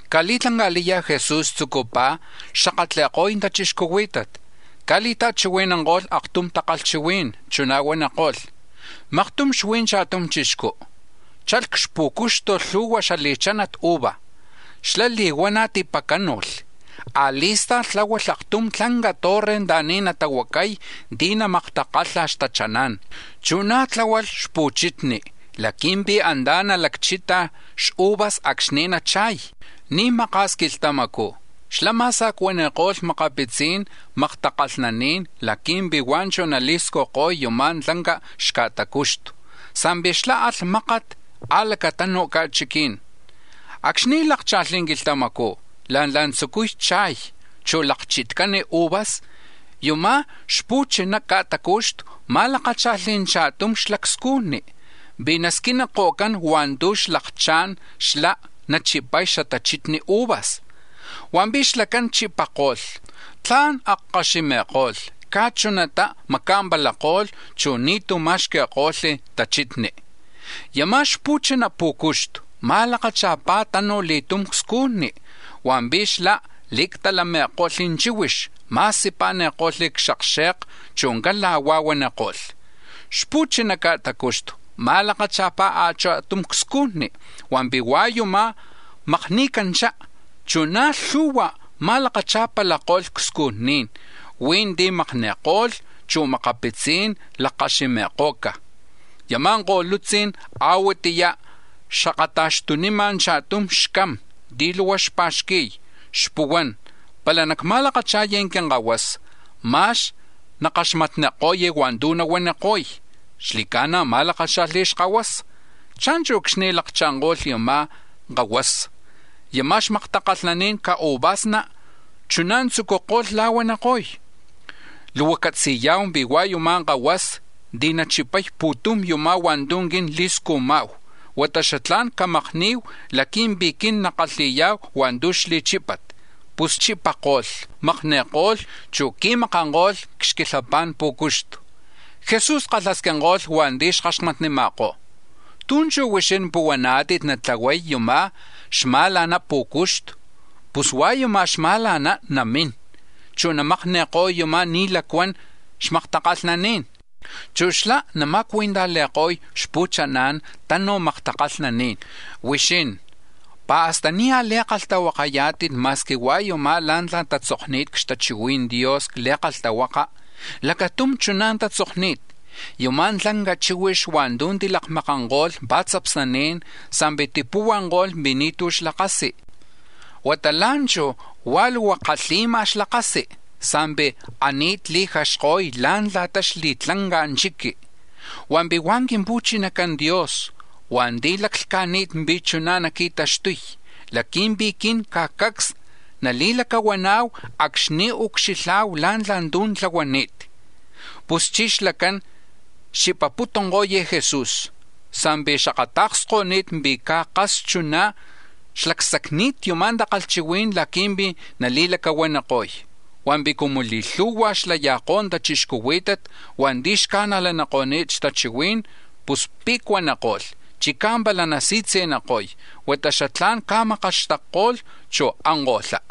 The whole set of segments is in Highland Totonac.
Caj li̱tlanca̱liya̱ Jesús tzucupaj xakatli̱ko̱y tachixcuhuí̱tat, caj li̱ta̱chihui̱nanko̱lh aktum takalhchihuí̱n, chuná̱ huaniko̱lh: “Maktum xuí̱ cha̱tum chixcú, chalh c-xpú̱cuxtu̱ lhu̱hua xali̱chanat uva. Xlá̱ li̱huana̱ tipacánu̱lh, a̱li̱sta̱lh tláhualh aktum tlanca torre anta̱ni̱ natahuacay ti̱ namaktakalha̱ xtachaná̱n. Chu̱ na̱ tláhualh xpu̱chitni̱ laqui̱mpi̱ antá̱ nalakchita̱ xuvas acxni̱ nacha̱y. Ni̱ maka̱s quilhtamacú̱ xlá̱ ma̱sa̱cuani̱ko̱lh makapitzi̱n maktakalhnaní̱n laqui̱mpi̱ huá̱ chú̱ nali̱scujko̱y yuma̱ tlanca xca̱tacuxtu, sa̱mpi̱ xlá̱ alh mákat c-a̱lacatanu̱ ca̱chiquí̱n. Acxni̱ lákcha̱lh quilhtamacú̱ la̱ntla̱ tzucuy cha̱y, chu̱ lakchitcán uvas, yama̱ xma̱la̱na ca̱tacuxtu̱ ma̱lakácha̱lh cha̱tum xlacscujni̱ pi̱ nasquiniko̱cán hua̱ntu̱ xlakchá̱n xlá̱ nachipay xatachitni uvas. Hua̱mpi̱ xlacán chipako̱lh, tla̱n akkaximi̱ko̱lh, caj chunatá̱ maca̱mpalako̱lh, chu̱ ni̱tú̱ ma̱xqui̱ko̱lh tachitni. Yama̱ xma̱la̱na pú̱cuxtu̱ ma̱lakacha̱pá̱ tanuj li̱tum cscujni, hua̱mpi̱ xlá̱ li̱actalami̱ko̱lh chíhuix, ma̱sipa̱ni̱ko̱lh c-xakxe̱ka, chu̱ cala̱huá̱ huaniko̱lh. Xma̱la̱na ca̱tacuxtu̱ ma̱lakacha̱pá̱ a̱cha̱tum cscujni, hua̱mpi̱ huá̱ yumá̱ makni̱canchá. Na̱ chuná̱ lhu̱hua̱ ma̱lakacha̱palako̱lh cscujní̱n; huí̱ ti̱ makni̱ko̱ca̱, chu̱ makapitzí̱n lakkaximi̱ko̱ca̱. “Yama̱ ko̱lutzí̱n a̱huatiyá̱ xakata̱xtunima̱ cha̱stum xcam ti̱ luhua xpa̱xqui̱y, xpuhuán: ‘Pala nacma̱lakacha̱y quinkahuasa, ma̱x nakaxmatniko̱y hua̱ntu̱ nahuaniko̱y.’ Xli̱ca̱na̱ ma̱lakácha̱lh xkahuasa. Cha̱nchu̱ acxni̱ lakcha̱nko̱lh yama̱ kahuasa, yama̱ xmaktakalhnani̱n xca̱uvasna̱ chuná̱ tzúculh la̱huaniko̱y: ‘Luhua catzi̱ya̱hu pi̱ hua̱ yuma̱ kahuasa̱ ti̱ nachipay pu̱tum yumá̱ hua̱ntu̱ quin li̱scujma̱hu, huata xatlá̱n camakni̱hu laqui̱mpi̱ quin nakalhi̱ya̱hu hua̱ntu̱ xli̱chípat.’ Pus chipako̱lh, makni̱ko̱lh, chu̱ tiqui̱makanko̱lh c-xquilhapa̱n pú̱cuxtu.” Jesús kalhasquinko̱lh hua̱nti̱ xkaxmatnima̱kó̱: “¿Tú̱ chú̱ huixín puhuaná̱tit natlahuay yama̱ xma̱la̱na pú̱cuxtu? Pus hua̱ yuma̱ xama̱la̱ná̱ namín, chu̱ namakni̱ko̱y yuma̱ ni̱ lacuan xmaktakalhnaní̱n, chu̱ xlá̱ nama̱cui̱ntajli̱ko̱y xpu̱chaná̱n tanuj maktakalhnaní̱n. “Huixín ¿pi̱ hasta ni̱ a̱li̱kalhtahuaka̱yá̱tit ma̱squi hua̱ yumá̱ la̱ntla̱ tatzokni̱t xtachihui̱n Dios c-Li̱kalhtahuaka? Lacatum chuná̱ tatzokni̱t: ‘Yama̱ tlanca chíhuix hua̱ntu̱ tilakmakanko̱lh pa̱tzapsnaní̱n sa̱mpi̱ tipuhuanko̱lh pi̱ ni̱tu̱ xlakasi, huata la̱nchú̱ huá̱ luhua kalhi̱ma̱ xlakasi sa̱mpi̱ ani̱t li̱jaxko̱y la̱ntla̱ta xli̱tlanca chiqui. Hua̱mpi̱ hua̱ Quimpu̱chinacan Dios hua̱nti̱ laclhca̱ni̱t pi̱ chuná̱ naqui̱taxtuy laqui̱mpi̱ quin caj cacs nali̱lacahuana̱hu acxni̱ ucxilha̱hu la̱ntla̱ tu̱ tlahuani̱t.’” Puschí̱ xlacán xchipaputunko̱y Jesús sa̱mpi̱ xakata̱ksko̱ni̱t pi̱ caj kas chuná xlacsacni̱t yuma̱ takalhchihuí̱n laqui̱mpi̱ nali̱ma̱lacahua̱ni̱ko̱y. Hua̱mpi̱ cumu li̱lhu̱hua̱ xlaya̱kó̱ tachixcuhuí̱tat hua̱nti̱ xca̱najlako̱ni̱t xtachihuí̱n, pus pe̱cuaniko̱lh, chicá̱ pala nasi̱tzi̱niko̱y, huata xatlá̱n caj makaxtakko̱lh, chu̱ anko̱lhá.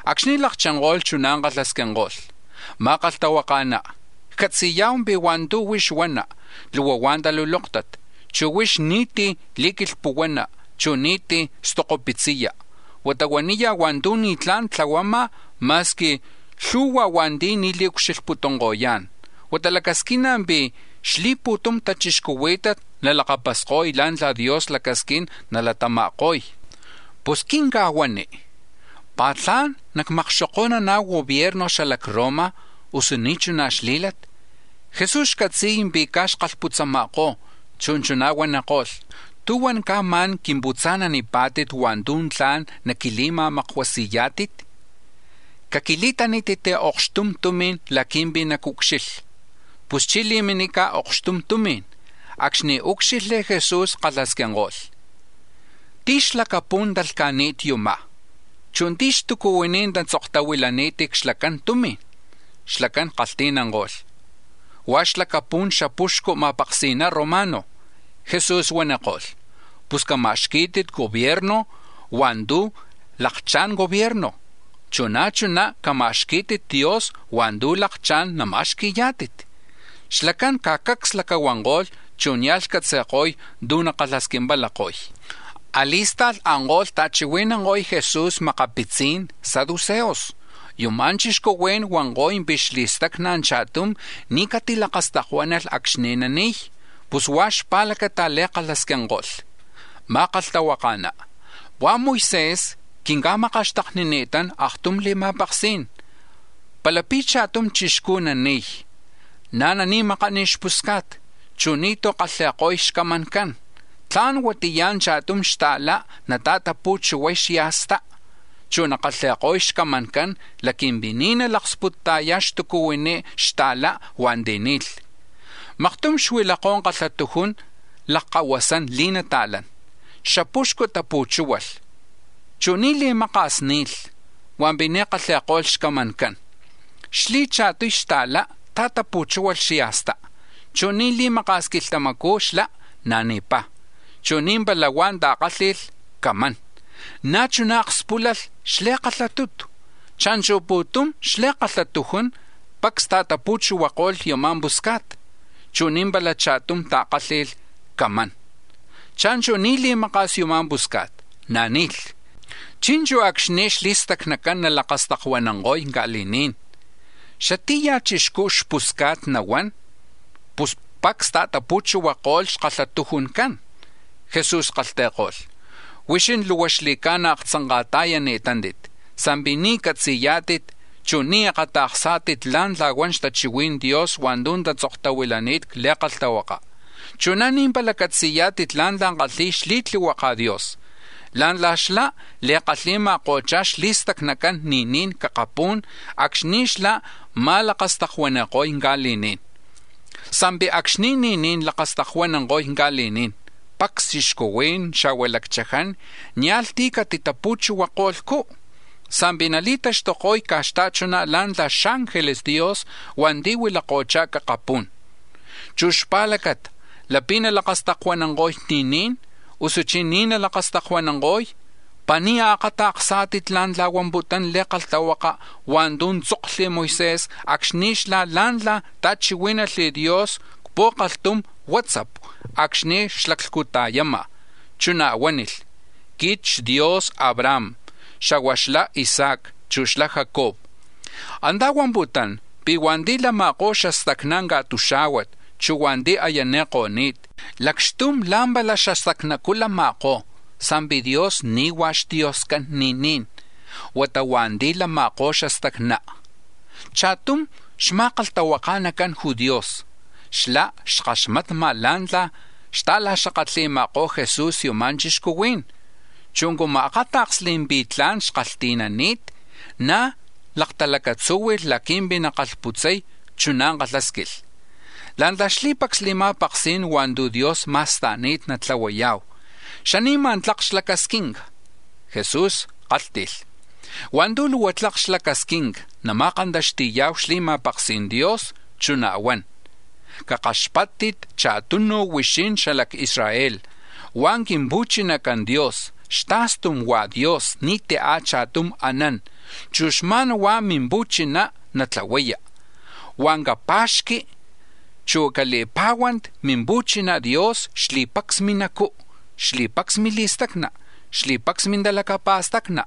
Acxni̱ lakchinko̱lh, chuná̱ kalhasquinko̱lh: —Ma̱kalhtahuaka̱ná, ccatzi̱ya̱hu pi̱ hua̱ntu̱ huix huana, luhua hua̱ talulóktat, chu̱ huix ni̱tí̱ li̱quilhpuhuana, chu̱ ni̱tí̱ lacsacpa̱xqui̱ya, huata huaniya̱ hua̱ntu̱ ni̱tlá̱n tlahuama̱, ma̱squi lhu̱hua̱ hua̱nti̱ ni̱ li̱ucxilhputunko̱yá̱n; huata lacasquina̱ pi̱ xli̱pu̱tum tachixcuhuí̱tat nalakapasko̱y la̱ntla̱ Dios lacasquín nalatama̱ko̱y. Pus quinca̱huani, ¿pá̱ tla̱n nacmakxoko̱nana̱hu gobierno xla Roma, usu ni̱ chuna xlí̱lat? Jesús xcatzi̱y pi̱ caj xkalhputzama̱kó̱, chu̱ chuná̱ huaniko̱lh: —¿Tú̱huan caj ma̱n quimputza̱nanipá̱tit hua̱ntu̱ tla̱n naquili̱ma̱makuasi̱yá̱tit? Caquili̱tanítit okxtum tumi̱n laqui̱mpi̱ nacucxilha. Puschí̱ li̱minica̱ okxtum tumi̱n; acxni̱ úcxilhli̱ Jesús kalhasquinko̱lh: —¿Tí̱ xlacapú̱n talhca̱ni̱t yumá̱? Chu̱ ¿tí̱ xtucuhuiní̱ tatzoktahuilani̱t c-xlacan tumi̱n? Xlacán kalhti̱nanko̱lh: —Huá̱ xlacapu̱n xapuxcu ma̱paksi̱na romano. Jesús huaniko̱lh: —Pus cama̱xquí̱tit gobierno hua̱ntu̱ lakchá̱n gobierno, chu̱ na̱ chuná̱ cama̱xquí̱tit Dios hua̱ntu̱ lakchá̱n namacama̱xqui̱yá̱tit. Xlacán caj cacs lacahuanko̱lh, chu̱ nia̱lh xcatzi̱ko̱y tú̱ nakalhasquimpalako̱y. A̱li̱sta̱lh anko̱lh ta̱chihui̱nanko̱y Jesús makapitzi̱n saduceos. Yuma̱ chixcuhuí̱n huanko̱y pi̱ xli̱stacna cha̱tum ni̱ catilakastakuánalh acxni̱ nani̱y, pus huá̱ xpa̱lacata̱ li̱kalhasquinko̱lh: —Ma̱kalhtahuaka̱ná, hua̱ Moisés quinca̱makaxtaknini̱tán aktum li̱ma̱paksí̱n, palapi̱ cha̱tum chixcú̱ nani̱y, na̱ nani̱makán xpusca̱t, chu̱ ni̱tú̱ kalhi̱ko̱y xcamancán, tla̱n huatiya̱ cha̱tum xta̱lá̱ nata̱tapu̱chuhuay xya̱stá, chu̱ nakalhi̱ko̱y xcamancán laqui̱mpi̱ ni̱ nalaksputa̱yay xtucuhuini xta̱lá̱ hua̱nti̱ ni̱lh. Maktum xuilakó̱ kalhatujun lakkahuasán li̱nata̱lán; xapuxcu̱ tapu̱chúhualh, chu̱ ni̱ li̱maka̱s ni̱lh, hua̱mpi̱ ni̱ kalhi̱ko̱lh xcamancán. Xli̱cha̱tuy xta̱lá̱ ta̱tapu̱chúhualh xya̱sta, chu̱ ni̱ li̱maka̱s quilhtamacú̱ xlá̱ na̱ ni̱pá̱, chu̱ ni̱mpala huá̱ ta̱kálhi̱lh camán. Na̱ chuná̱ akspúlalh xli̱kalhatutu. Cha̱nchu̱ pu̱tum xli̱kalhatujuncán, pacs ta̱tapu̱chuhuako̱lh yama̱ pusca̱t, chu̱ ni̱ pala cha̱tum ta̱kálhi̱lh camán. Cha̱nchu̱ ni̱ li̱maka̱s yama̱ pusca̱t na̱ ni̱lh. Chi̱nchu̱ acxni̱ xli̱stacnacán nalakastakuananko̱y ca̱li̱ní̱n, ¿xatí̱ ya̱ chixcú̱ xpusca̱t nahuán, pus pacs ta̱tapu̱chuhuako̱lh xkalhatujuncán? Jesús kalhti̱ko̱lh: —Huixín luhua xli̱ca̱na̱ aktzanka̱ta̱yani̱tántit, sa̱mpi̱ ni̱ catzi̱yá̱tit, chu̱ ni̱ akata̱ksá̱tit la̱ntla̱ huan xtachihui̱n Dios hua̱ntu̱ tatzoktahuilani̱t c-Li̱kalhtahuaka, chu̱ na̱ ni̱ pala catzi̱yá̱tit la̱ntla̱ kalhi̱y xli̱tlihuaka̱ Dios, la̱ntla̱ xlá̱ li̱kalhi̱ma̱ko̱chá̱ xli̱stacnacan ni̱ní̱n c-akapú̱n acxni̱ xlá̱ ma̱lakastakuani̱ko̱y ca̱li̱ní̱n. Sa̱mpi̱ acxni̱ ni̱ní̱n lakastakuananko̱y ca̱li̱ní̱n, pacs chixcuhuí̱n, xa̱hua̱ lacchaján, nia̱lh tí̱ catitapu̱chuhuako̱lhcú, sa̱mpi̱ nali̱taxtuko̱y caj xta̱chuná̱ la̱ntla̱ xángeles Dios hua̱nti̱ huilako̱chá̱ c-akapú̱n. Chu̱ hua̱ xpa̱lacata, lapi̱ nalakastakuananko̱y ni̱ní̱n, usuchí̱ ni̱ nalakastakuananko̱y, ¿pi̱ ni̱ akata̱ksá̱tit la̱ntla̱ huamputún Li̱kalhtahuaka̱ hua̱ntu̱ tzokli̱ Moisés acxni̱ xlá̱ la̱ntla̱ ta̱chihuí̱nalh Dios c-pu̱kalhtum huátzapu, acxni̱ xaclhcuta̱yama̱, chuná̱ huánilh: ‘Quit xDios Abraham, xa̱hua̱ xla Isaac, chu̱ xla Jacob.’ Antá̱ huamputún pi̱ hua̱nti̱ lama̱kó̱ xastacná̱ ca̱tuxá̱huat, chu̱ hua̱nti̱ aya ni̱ko̱ni̱t, lacxtum la̱mpala xastacnacú̱ lama̱kó̱, sa̱mpi̱ Dios ni̱ hua̱ xDioscán ni̱ní̱n, huata hua̱nti̱ lama̱kó̱ xastacná. Cha̱tum xma̱kalhtahuaka̱nacan judíos, xlá̱ xkalhakaxmatma̱ la̱ntla̱ xta̱la̱huanima̱kó̱ Jesús yama̱ chixcuhuí̱n, chu̱ cumu akáta̱ksli̱ pi̱ tla̱n xkalhti̱nani̱t, na̱ laktalacatzúhui̱lh laqui̱mpi̱ nakalhputzay, chuná̱ kalhásquilh: —La̱ntla̱ xli̱pacs li̱ma̱paksí̱n hua̱ntu̱ Dios ma̱sta̱ni̱t natlahuaya̱hu, ¿xani̱ma̱ tlak xlacasquinca? Jesús kálhti̱lh: —Hua̱ntu̱ luhua tlak xlacasquinca nama̱kantaxti̱ya̱hu xli̱ma̱paksi̱n Dios, chuná̱ huan: ‘Cakaxpáttit cha̱tunu̱ huixín xala c-Israel, hua̱ Quimpu̱chinacán Dios, xta̱stum huá̱ Dios, ni̱tí̱ a̱cha̱tum anán, chu̱ xma̱n huá̱ Mimpu̱chiná̱ natlahuaya. Huá̱ capa̱xqui, chu̱ cali̱pá̱huanti̱ Mimpu̱china Dios xli̱pacs minacú̱, xli̱pacs mili̱stacna, xli̱pacs mintalacapa̱stacni,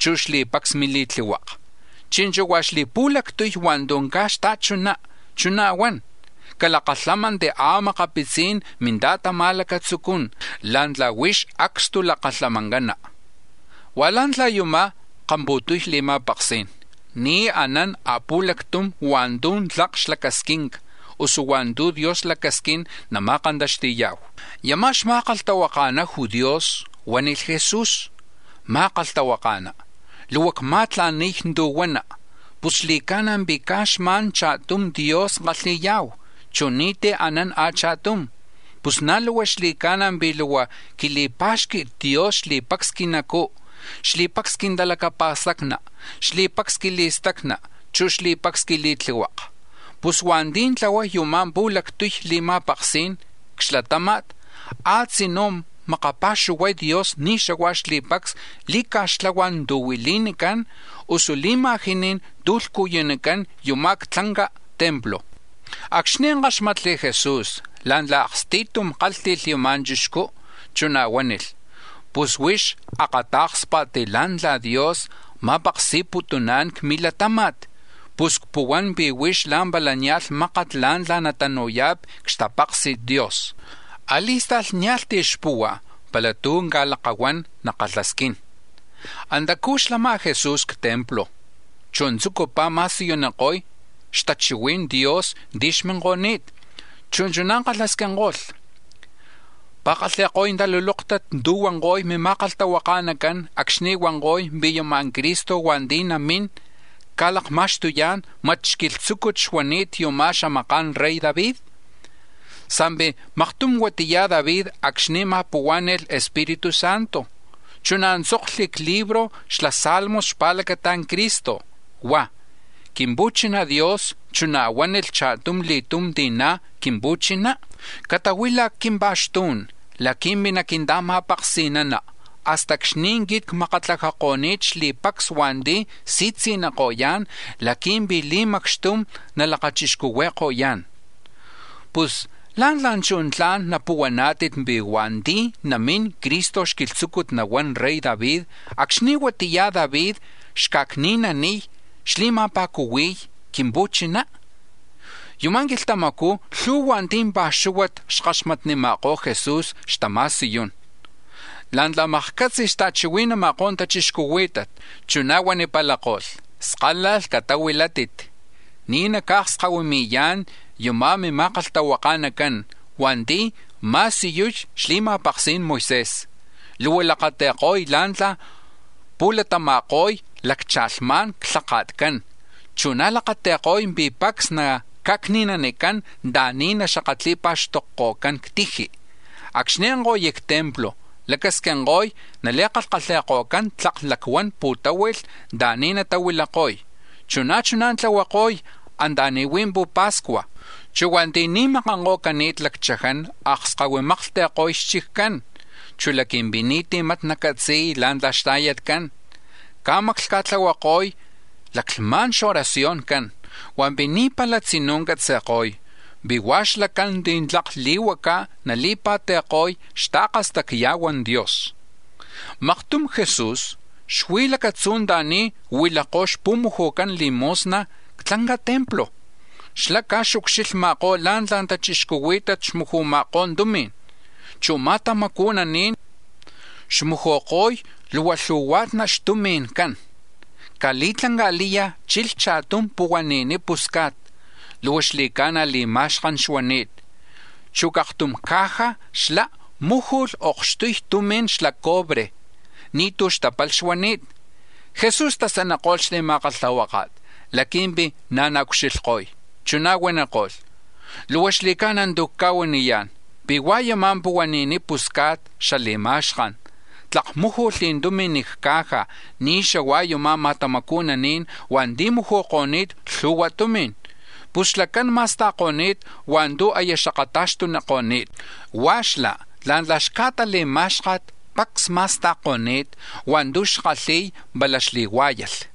chu̱ xli̱pacs mili̱tlihuaka.’ Chi̱nchu̱ hua̱ xli̱pu̱lactuy hua̱ntu̱ na̱ caj xta̱chuná, chuná̱ huan: ‘Calakalhámanti̱ a̱makapitzí̱n minta̱tama̱lacatzucún la̱ntla̱ huix acstulakalhamancana.’ Hua̱ la̱ntla̱ yuma̱ kampa̱tuy li̱ma̱paksí̱n, ni̱ anán a̱pu̱lactum hua̱ntu̱ tlak xlacasquinca, usu hua̱ntu̱ Dios lacasquín nama̱kantaxti̱ya̱hu. Yama̱ xma̱kalhtahuaka̱na judíos huánilh Jesús: —Ma̱kalhtahuaka̱ná, luhua cma̱tla̱ni̱y tu̱ huana, pus xli̱ca̱na̱ pi̱ caj xma̱n cha̱tum Dios kalhi̱ya̱hu, chu̱ ni̱tí̱ anán a̱cha̱tum. Pus na̱ luhua xli̱ca̱na̱ pi̱ luhua quili̱pá̱xqui̱t Dios xli̱pacs quinacú̱, xli̱pacs quintalacapa̱stacni, xli̱pacs quili̱stacna, chu̱ xli̱pacs quili̱tlihuaka. Pus hua̱nti̱ tlahuay yuma̱ pu̱lactuy li̱ma̱paksí̱n c-xlatáma̱t, a̱tzinú̱ makapa̱xuhuay Dios ni̱ xahua̱ xli̱pacs li̱ca̱xtlahuá̱n tu̱ nahuili̱nicán, usu li̱ma̱jiní̱n tu̱ lhcuyunicán yuma̱ c-tlanca templo. Acxni̱ káxmatli̱ Jesús la̱ntla̱ aksti̱tum kálhti̱lh yama̱ chixcú, chuná̱ huánilh: —Pus huix akatá̱kspa̱t la̱ Dios ma̱paksi̱namputún c-milatáma̱t, chu̱ cpuhuán pi̱ huix la̱mpala nia̱lh mákat la̱ntla̱ natanu̱ya̱pi̱ c-xtapaksi̱t Dios. A̱li̱sta̱lh nia̱lh tí̱ xpuhua̱ pala tú̱ caj lakahuán nakalhasquín. Antacú̱ xlama̱ Jesús c-templo, chu̱ tzucupaj ma̱siyuniko̱y xtachihui̱n Dios ti̱ xminko̱ni̱t, chu̱ chuná̱ kalhasquinko̱lh: —¿Pi̱ kalhi̱ko̱y talulóktat tu̱ huanko̱y mima̱kalhtahuaka̱nacán acxni̱ huanko̱y pi̱ yama̱ Cristo hua̱nti̱ namín ca̱lakma̱xtuyá̱n, mat xquilhtzúcut xuani̱t yama̱ xamaka̱n rey David? Sa̱mpi̱ maktum huatiya David acxni̱ ma̱puhuá̱ni̱lh Espíritu Santo, chuná̱ tzokli̱ c-libro xla Salmos xpa̱lacata Cristo, huá̱: ‘Quimpu̱china Dios chuná̱ huánilh cha̱tum li̱tum ti̱ na̱ Quimpu̱chiná: Catahuila̱ c-quimpa̱xtú̱n laqui̱mpi̱ naquinta̱ma̱paksi̱nana, hasta acxni̱ quit cmakatlajako̱ni̱t xli̱pacs hua̱nti̱ si̱tzi̱niko̱yá̱n laqui̱mpi̱ li̱macxtum nalakachixcuhui̱ko̱yá̱n.’ Pus ¿lá̱ntla̱ chú̱ tla̱n napuhuaná̱tit pi̱ hua̱nti̱ namín Cristo xquilhtzúcut nahuán rey David acxni̱ huatiya David xca̱cni̱naniy, xli̱ma̱pa̱cuhui̱y Quimpu̱chiná? Yama̱ quilhtamacú̱ lhu̱hua̱ cha̱pa̱xuhua̱na̱ xkaxmatnima̱kó̱ Jesús xtama̱siyún. La̱ntla̱ makcatzi xta̱chihui̱nama̱kó̱ tachixcuhuí̱tat, chuná̱ huanipalako̱lh: “Skálalh catahuilátit, ni̱ naca̱akskahuimi̱yá̱n yama̱ mima̱kalhtahuaka̱nacán hua̱nti̱ ma̱siyuy xli̱ma̱paksi̱n Moisés. Luhua lakati̱ko̱y la̱ntla̱ pu̱latama̱ko̱y laccha̱lhma̱nxlhaka̱tcán, chu̱ na̱ lakati̱ko̱y pi̱ pacs naca̱cni̱nanicán anta̱ni̱ naxakatli̱pa̱xtokko̱cán c-tiji. Acxni̱ anko̱y c-templo lacasquinko̱y nali̱kalhi̱ko̱cán tlak lacuan pu̱táhui̱lh anta̱ni̱ natahuilako̱y, chu̱ na̱ chuná̱ tlahuako̱y anta̱ni̱ huí̱ pu̱pa̱scua̱. Chu̱ hua̱nti̱ ni̱makanko̱cani̱t lacchaján akskahuimaklhti̱ko̱y xchiccán, chu̱ laqui̱mpi̱ ni̱tí̱ mat nacatzi̱y la̱ntla̱ xta̱yatcán, caj maclhca̱tlahuako̱y laclhma̱n xoracioncán. Hua̱mpi̱ ni̱ pala tzinú̱ catzi̱ko̱y pi̱ hua̱ xlacán ti̱ tlak li̱huacá̱ nali̱pa̱ti̱ko̱y xta̱kastacya̱huan Dios.” Maktum Jesús xuí̱ lacatzú̱ anta̱ni̱ huilakó̱ xpu̱muju̱can limosna c-tlanca templo. Xlá̱ caj xucxilhma̱kó̱ la̱ntla̱ tachixcuhuí̱tat xmuju̱ma̱kó̱ tumi̱n, chu̱ lacricujni̱ xmuju̱ko̱y luhua lhu̱hua̱tna̱ xtumi̱ncán. Caj li̱tlanca̱liya̱ chilh cha̱tum puni̱ni̱ pusca̱t, luhua xli̱ca̱na̱ li̱ma̱xkan xuani̱t, chu̱ c-aktum caja xlá̱ múju̱lh okxtuy tumi̱n xla cobre, ni̱tú̱ xtápalh xuani̱t. Jesús tasaniko̱lh xli̱ma̱kalhtahuáka̱t laqui̱mpi̱ na̱ naucxilhko̱y. Chuná̱ huaniko̱lh: —Luhua xli̱ca̱na̱ tu̱ cca̱huaniyá̱n pi̱ hua̱ yuma̱ puni̱ni̱ pusca̱t xali̱ma̱xkan, tlak múju̱lh tumi̱n c-ca̱ja̱ ni̱ xahua̱ yama̱ lacricujni̱ hua̱nti̱ muju̱ko̱ni̱t lhu̱hua tumi̱n. Pus xlacán ma̱sta̱ko̱ni̱t hua̱ntu̱ aya xakata̱xtuniko̱ni̱t, hua̱ xlá̱ la̱ntla̱ xca̱tali̱má̱xka̱t pacs ma̱sta̱ko̱ni̱t hua̱ntu̱ xkalhi̱y pala xli̱huá̱yalh.